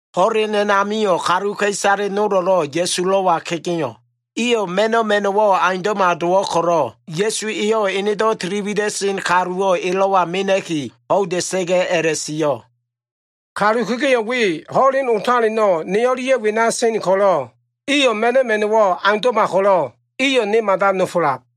Ho꞉len a꞉namio꞉ kaluka꞉isale nolo꞉lo꞉ Ya꞉sulo꞉wa kegeo꞉. Iyo꞉ ma꞉no꞉ ma꞉no꞉wo꞉ aundo꞉ma dowo꞉ ko꞉lo꞉, Ya꞉su eyo꞉ enedo꞉ tiliwida꞉sen kaluwo꞉ elo꞉wa mena꞉ki ho꞉ida꞉sa꞉ga꞉ a꞉la꞉sio꞉, “Kalu kegeo꞉ we ho꞉len otaleno꞉ ne o꞉lia꞉ wena sen ko꞉lo꞉, iyo꞉ ma꞉no꞉ ma꞉no꞉wo꞉ aundo꞉ma ko꞉lo꞉, iyo꞉ ne mada nofolab.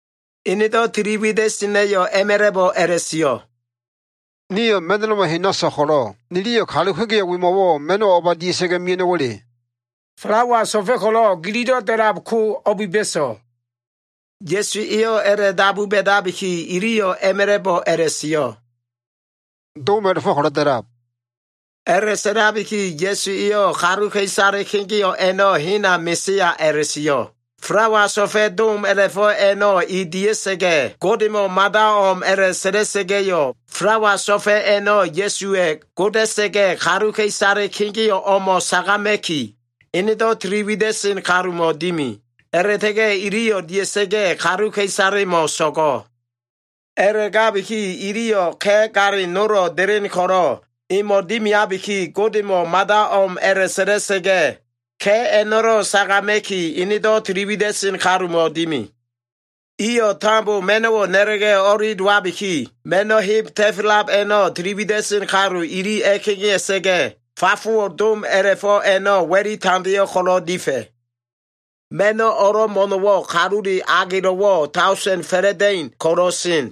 Enedo꞉ tili wida꞉sena꞉yo꞉ a꞉ma꞉la꞉bo꞉ a꞉la꞉sio꞉, “Nio꞉ ma꞉no꞉loma hena so꞉l ko꞉lo꞉, niliyo꞉ kalu kegeo꞉ wemo꞉wo꞉ ma꞉no꞉wo꞉ o꞉ba dia꞉sa꞉ga꞉ mea꞉no꞉wa꞉le?” “Falawa so꞉fa꞉ ko꞉lo꞉ gililo꞉ da꞉lab ko o꞉biba꞉so꞉?” Ya꞉su eyo꞉ a꞉la꞉dabu ba꞉dabiki, iliyo꞉ a꞉ma꞉la꞉bo꞉ a꞉la꞉sio꞉, “Dom a꞉la꞉fo꞉ ko꞉lo꞉ da꞉lab.” A꞉la꞉sa꞉labiki Ya꞉su eyo꞉ kaluka꞉isale kegeo꞉ a꞉no꞉ hena mesea a꞉la꞉sio꞉. Falawa so꞉fa꞉ dom a꞉la꞉fo꞉ a꞉no꞉ e dia꞉sa꞉ga꞉, Godemo꞉ mada o꞉m a꞉la꞉sa꞉la꞉sa꞉ga꞉yo꞉, falawa so꞉fa꞉ a꞉no꞉ Ya꞉suwa꞉ goda꞉sa꞉ga꞉, kaluka꞉isale kegeo꞉ o꞉mo꞉ sagama꞉ki enedo꞉ tiliwida꞉sen kalumo꞉ dimi. A꞉la꞉ta꞉ga꞉ iliyo꞉ dia꞉sa꞉ga꞉, kaluka꞉isalemo꞉ so꞉go꞉. A꞉la꞉gabiki iliyo꞉ ka꞉ galin nolo꞉ delen ko꞉lo꞉, emo꞉ dimiabiki, Godemo꞉ mada o꞉m a꞉la꞉sa꞉la꞉sa꞉ga꞉, ka꞉ a꞉no꞉lo꞉ sagama꞉ki, enedo꞉ tiliwida꞉sen kalumo꞉ dimi. Iyo꞉ tambo ma꞉no꞉wo꞉ na꞉la꞉ga꞉ o꞉li dowabiki, ma꞉no꞉ heb ta꞉fa꞉lab a꞉no꞉ tiliwida꞉sen kalu ili a꞉kegea꞉sa꞉ga꞉, fafowo꞉ dom a꞉la꞉fo꞉ a꞉no꞉ wa꞉li tandeo꞉ ko꞉lo꞉ difa꞉. Ma꞉no꞉ o꞉lo꞉ mo꞉no꞉wo꞉, kalule agelo꞉wo꞉ daosen fa꞉la꞉da꞉in ko꞉lo꞉ sen.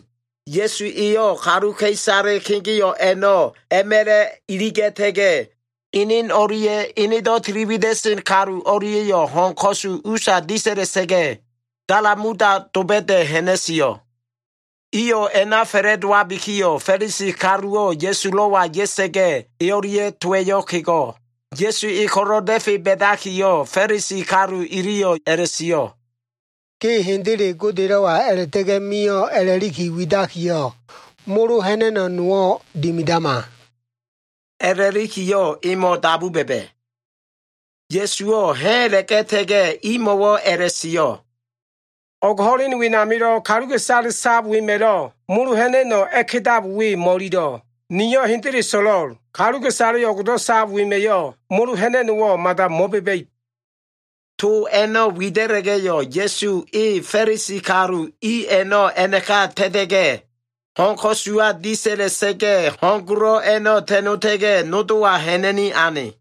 Ya꞉su eyo꞉ kaluka꞉isale kegeo꞉ a꞉no꞉ a꞉ma꞉la꞉ iliga꞉ta꞉ga꞉, enen o꞉lia꞉ enedo꞉ tiliwida꞉sen kalu o꞉lia꞉yo꞉ ho꞉n ko꞉su usa disa꞉la꞉sa꞉ga꞉, Damanuta doba꞉da꞉ ha꞉na꞉sio꞉. Iyo꞉ a꞉na fa꞉la꞉dowabikiyo꞉, Fa꞉lisi kaluwo꞉ Ya꞉sulo꞉wa ya꞉sa꞉ga꞉, e o꞉lia꞉ towa꞉yo꞉ kego꞉. Ya꞉su e ko꞉lo꞉ da꞉fe ba꞉dakiyo꞉, Fa꞉lisi kalu iliyo꞉ a꞉la꞉sio꞉, “Ge hendele Godelo꞉wa a꞉la꞉ta꞉ga꞉ mio꞉ a꞉la꞉liki widakiyo꞉, molo ha꞉na꞉no꞉ nowo꞉ dimidama” a꞉la꞉likiyo꞉, emo꞉ dabu ba꞉ba꞉. Ya꞉suwo꞉ ha꞉ a꞉la꞉ga꞉ta꞉ga꞉, imo꞉wo꞉ a꞉la꞉sio꞉, “O꞉g ho꞉len wenamilo꞉ kaluka꞉isale sab wema꞉lo꞉ molo ha꞉na꞉no꞉ a꞉kedab we mo꞉lilo꞉. Niyo꞉ hendele so꞉lo꞉l, kaluka꞉isale o꞉gdo꞉ sab wema꞉yo꞉ molo ha꞉na꞉no꞉wo꞉ mada mo꞉ba꞉ba꞉ib.” To a꞉no꞉ wida꞉la꞉ga꞉yo꞉, Ya꞉su e Fa꞉lisi kalu i a꞉no꞉ a꞉naka ta꞉ta꞉ga꞉yo꞉, ho꞉n ko꞉suwa disa꞉la꞉sa꞉ga꞉, ho꞉n golo꞉ a꞉no꞉ ta꞉nota꞉ga꞉, nodowa ha꞉na꞉ni ane.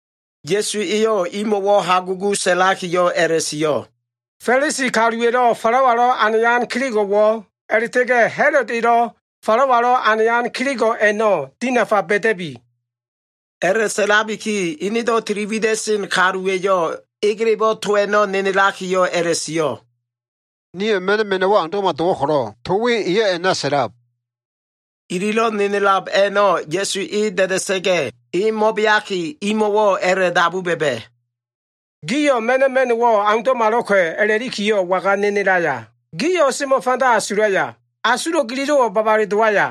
Ya꞉su eyo꞉ imo꞉wo꞉ hagugu sa꞉lakiyo꞉ a꞉la꞉sio꞉, “Fa꞉lisi kaluwa꞉lo꞉ falawalo꞉ anayan kelego꞉wo꞉, a꞉la꞉ta꞉ga꞉ Ha꞉lod elo꞉ falawalo꞉ anayan kelego꞉ a꞉no꞉ dinafa ba꞉da꞉bi.” A꞉la꞉sa꞉labiki enedo꞉ tili wida꞉sen kaluwa꞉yo꞉ egelebo꞉ to a꞉no꞉ nenelakiyo꞉ a꞉la꞉sio꞉, “Nio꞉ ma꞉no꞉ ma꞉no꞉wo꞉ aundo꞉ma dowo꞉ ko꞉lo꞉, to we eyo꞉ a꞉na sa꞉lab.” Ililo꞉ nenelab a꞉no꞉ Ya꞉su e da꞉da꞉sa꞉ga꞉, e mo꞉beaki imo꞉wo꞉ a꞉la꞉dabu ba꞉ba꞉, “Gio꞉ ma꞉no꞉ ma꞉no꞉wo꞉ aundo꞉malo꞉ka꞉ a꞉la꞉likiyo꞉ waga nenelaya? Gio꞉ o꞉semo꞉ fanda asulaya? Asulo꞉ gililo꞉wo꞉ babale dowaya?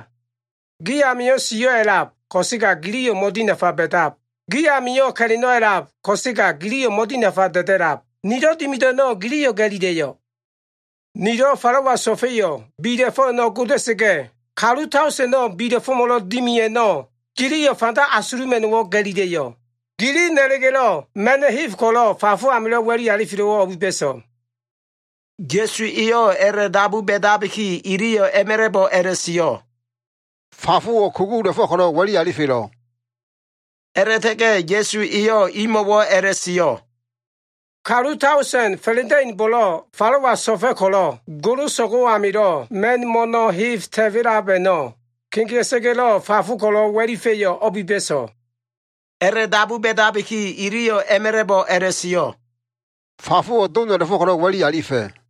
Gi amio꞉ siyo꞉ a꞉lab, ko꞉sega giliyo꞉ mo꞉dinafa ba꞉dab. Gi amio꞉ ka꞉la꞉no꞉ a꞉lab, ko꞉sega giliyo꞉ mo꞉dinafa da꞉da꞉lab. Nilo꞉ dimido꞉ a꞉no꞉ giliyo꞉ ga꞉lila꞉yo꞉? Nilo꞉ falawa so꞉fa꞉yo꞉ bila꞉fo꞉ a꞉no꞉ goda꞉sa꞉ga꞉, kalu daosen bila꞉fo꞉mo꞉lo꞉ dimi a꞉no꞉, gio꞉ fanda asuluma꞉no꞉wo꞉ ga꞉lila꞉yo꞉? Gili na꞉la꞉ga꞉lo꞉ ma꞉no꞉ heb ko꞉lo꞉ fafo amilo꞉ wa꞉li alifelo꞉wo꞉ o꞉biba꞉so꞉?” Ya꞉su eyo꞉ a꞉la꞉dabu ba꞉dabiki, iliyo꞉ a꞉ma꞉la꞉bo꞉ a꞉la꞉sio꞉, “Fafowo꞉ kugula꞉fo꞉ ko꞉lo꞉ wa꞉li alifelo꞉.” A꞉la꞉ta꞉ga꞉ Ya꞉su eyo꞉ imo꞉wo꞉ a꞉la꞉sio꞉, “Kalu daosen fa꞉la꞉da꞉inbo꞉lo꞉ falawa so꞉fa꞉ ko꞉lo꞉, goloso꞉go꞉ amio꞉ ma꞉n mo꞉no꞉ heb ta꞉fa꞉lab a꞉no꞉ kegea꞉sa꞉ga꞉lo꞉ fafo ko꞉lo꞉ wa꞉lifa꞉yo꞉ o꞉biba꞉so꞉?” A꞉la꞉dabu ba꞉dabiki iliyo꞉ a꞉ma꞉la꞉bo꞉ a꞉la꞉sio꞉, “Fafowo꞉ doma꞉la꞉fo꞉ ko꞉lo꞉ wa꞉li alifa꞉.”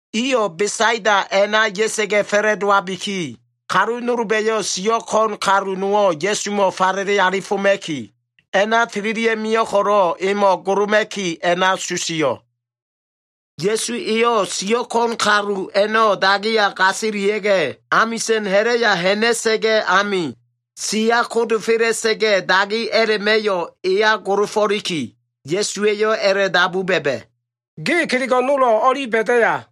Iyo꞉ Besaida a꞉na ya꞉sa꞉ga꞉ fa꞉la꞉dowabiki, kalu nolba꞉yo꞉ siyo꞉ ko꞉n kalu nowo꞉ Ya꞉sumo꞉ falele alifoma꞉ki, a꞉na tililia꞉ mio꞉ ko꞉lo꞉, emo꞉ goloma꞉ki a꞉na susio꞉. Ya꞉su eyo꞉ siyo꞉ ko꞉n kalu a꞉no꞉ dagiya gasilia꞉ga꞉, amisa꞉n ha꞉la꞉ya ha꞉na꞉sa꞉ga꞉ ami, siya kodofela꞉sa꞉ga꞉, dagi a꞉la꞉ma꞉yo꞉ eya golofo꞉liki, Ya꞉suwa꞉yo꞉ a꞉la꞉dabu ba꞉ba꞉, “Ge kelego꞉ nolo꞉ o꞉li ba꞉daya?”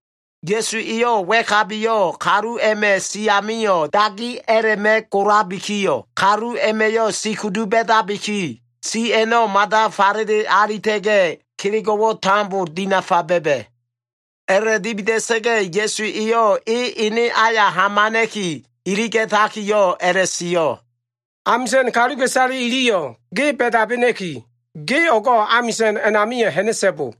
Ya꞉su eyo꞉ wa꞉kabiyo꞉ kalu a꞉ma꞉ si amio꞉ dagi a꞉la꞉ma꞉ golabikiyo꞉, kalu a꞉ma꞉yo꞉ si kudu ba꞉dabiki, si a꞉no꞉ mada falele alita꞉ga꞉, kelego꞉wo꞉ tambo dinafa ba꞉ba꞉. A꞉la꞉dimida꞉sa꞉ga꞉ Ya꞉su eyo꞉ e ene aya hamana꞉ki iliga꞉takiyo꞉ a꞉la꞉sio꞉, “Amisa꞉n kaluka꞉isale iliyo꞉ ge ba꞉dabena꞉ki, ge o꞉go꞉ amisa꞉n amio꞉ ha꞉na꞉so꞉bo.”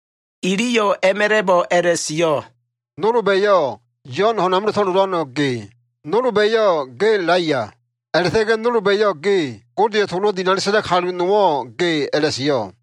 Iliyo꞉ a꞉ma꞉la꞉bo꞉ a꞉la꞉sio꞉, “Nolba꞉yo꞉ Yo꞉n ho꞉n amilo꞉ to꞉lolano꞉ ge. Nolba꞉yo꞉ ge Elaiya. A꞉la꞉ta꞉ga꞉ nolba꞉yo꞉ ge Godeya꞉ tolo꞉ dinali sa꞉lan kalu nowo꞉ ge, a꞉la꞉sio꞉.”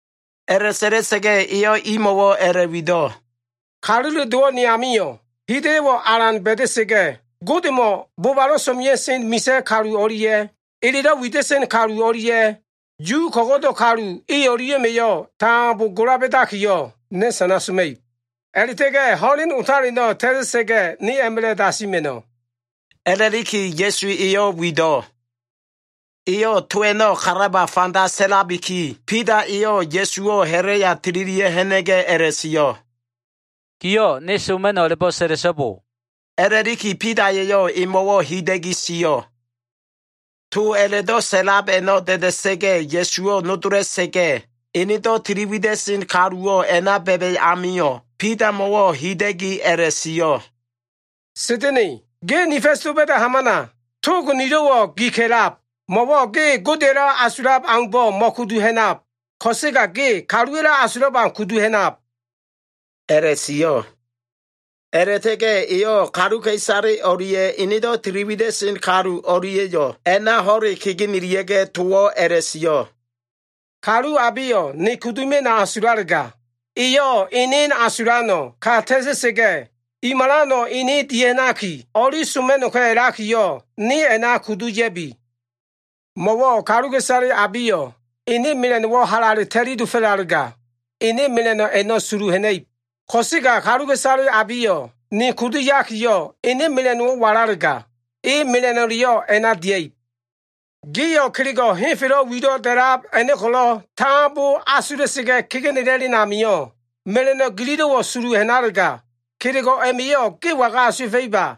A꞉la꞉sa꞉la꞉sa꞉ga꞉ eyo꞉ imo꞉wo꞉ a꞉la꞉wido꞉, “Kalule Dowo꞉ nemo꞉wo꞉ hida꞉yo꞉ alan dimia꞉ib. Godemo꞉ bobalo꞉ so꞉mea꞉sen misa꞉ kalu o꞉lia꞉ elelo꞉ wida꞉sen kalu o꞉lia꞉ Yu ko꞉go꞉do꞉ kalu i o꞉lia꞉ma꞉yo꞉ tambo gola ba꞉dakiyo꞉, ne sana soma꞉ib. A꞉la꞉ta꞉ga꞉ ho꞉len otaleno꞉ ta꞉ta꞉sa꞉ga꞉, ne a꞉ma꞉la꞉ dasima꞉no꞉,” a꞉la꞉liki Ya꞉su eyo꞉ wido꞉. Eyo꞉ to a꞉no꞉ kalaba fanda sa꞉labiki, Bida eyo꞉ Ya꞉suwo꞉ ha꞉la꞉ya tililia꞉ ha꞉na꞉ga꞉ a꞉la꞉sio꞉, “Giyo꞉ ‘Ne soma꞉no꞉’ a꞉la꞉bo꞉ sa꞉la꞉so꞉bo,” a꞉la꞉liki Bida eyo꞉ emo꞉wo꞉ hida꞉gi sio꞉. To a꞉la꞉do꞉ sa꞉lab a꞉no꞉ da꞉da꞉sa꞉ga꞉, Ya꞉suwo꞉ nodola꞉sa꞉ga꞉, enedo꞉ tili wida꞉sen kaluwo꞉ a꞉na ba꞉ba꞉ amio꞉, Bidamo꞉wo꞉ hida꞉gi sio꞉, “Sa꞉da꞉na꞉, ge ni fa꞉s doba꞉da꞉ hamana. Tog nilo꞉wo꞉ gi ka꞉lab. Mo꞉wo꞉ ge Godeya꞉lo꞉ asulab aumbo꞉ mo꞉kudu ha꞉nab. Ko꞉sega ge kaluwa꞉lo꞉ asulab au kudu ha꞉nab,” a꞉la꞉sio꞉. A꞉la꞉ta꞉ga꞉ eyo꞉ kaluka꞉isale o꞉lia꞉ enedo꞉ tili wida꞉sen kalu o꞉lia꞉yo꞉ a꞉na ho꞉le kegenelia꞉ga꞉ towo꞉ a꞉la꞉sio꞉, “Kalu abeyo꞉ ne kudu mia꞉no꞉ asulalega, eyo꞉ enen asulano꞉ ka ta꞉ta꞉sa꞉ga꞉, i malano꞉ ene dia꞉ha꞉naki o꞉li soma꞉no꞉ka꞉ a꞉lakiyo꞉, ne a꞉na kudu ya꞉bi. Mo꞉wo꞉ kaluka꞉isale abeyo꞉ ene mela꞉no꞉wo꞉ halale ta꞉li dofo꞉lalega, ene mela꞉no꞉ a꞉no꞉ sulu ha꞉na꞉ib. Ko꞉sega kaluka꞉isale abeyo꞉ ne kudu yakiyo꞉, ene mela꞉no꞉wo꞉ walalega, e mela꞉no꞉leyo꞉ a꞉na dia꞉ib. Gio꞉ kelego꞉ henfelo꞉ wilo꞉ da꞉lab a꞉no꞉ ko꞉lo꞉ tambo asula꞉sa꞉ga꞉ kegenela꞉len amio꞉, mela꞉no꞉ gilo꞉wo꞉ sulu ha꞉nalega, kelego꞉ a꞉ma꞉yo꞉ ge waga asuwa꞉fa꞉iba?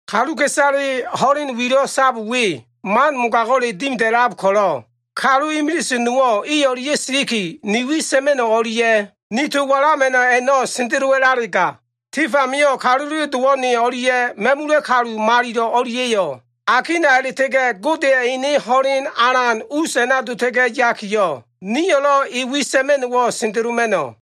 Kaluka꞉isale ho꞉len wilo꞉ sab we man mogago꞉le dimida꞉lab ko꞉lo꞉, kalu imilise nowo꞉ i o꞉lia꞉ siliki, ni wi sa꞉ma꞉no꞉ o꞉lia꞉ ni to walama꞉no꞉ a꞉no꞉ sendelowa꞉lalega, tif amio꞉ Kalule Dowo꞉ ne o꞉lia꞉ ma꞉mula꞉ kalu malilo꞉ o꞉lia꞉yo꞉, akina a꞉la꞉ta꞉ga꞉ Godeya꞉ ene ho꞉len alan us a꞉na dota꞉ga꞉ yakiyo꞉, niyo꞉lo꞉ e wi sa꞉ma꞉no꞉wo꞉ sendeloma꞉no꞉.”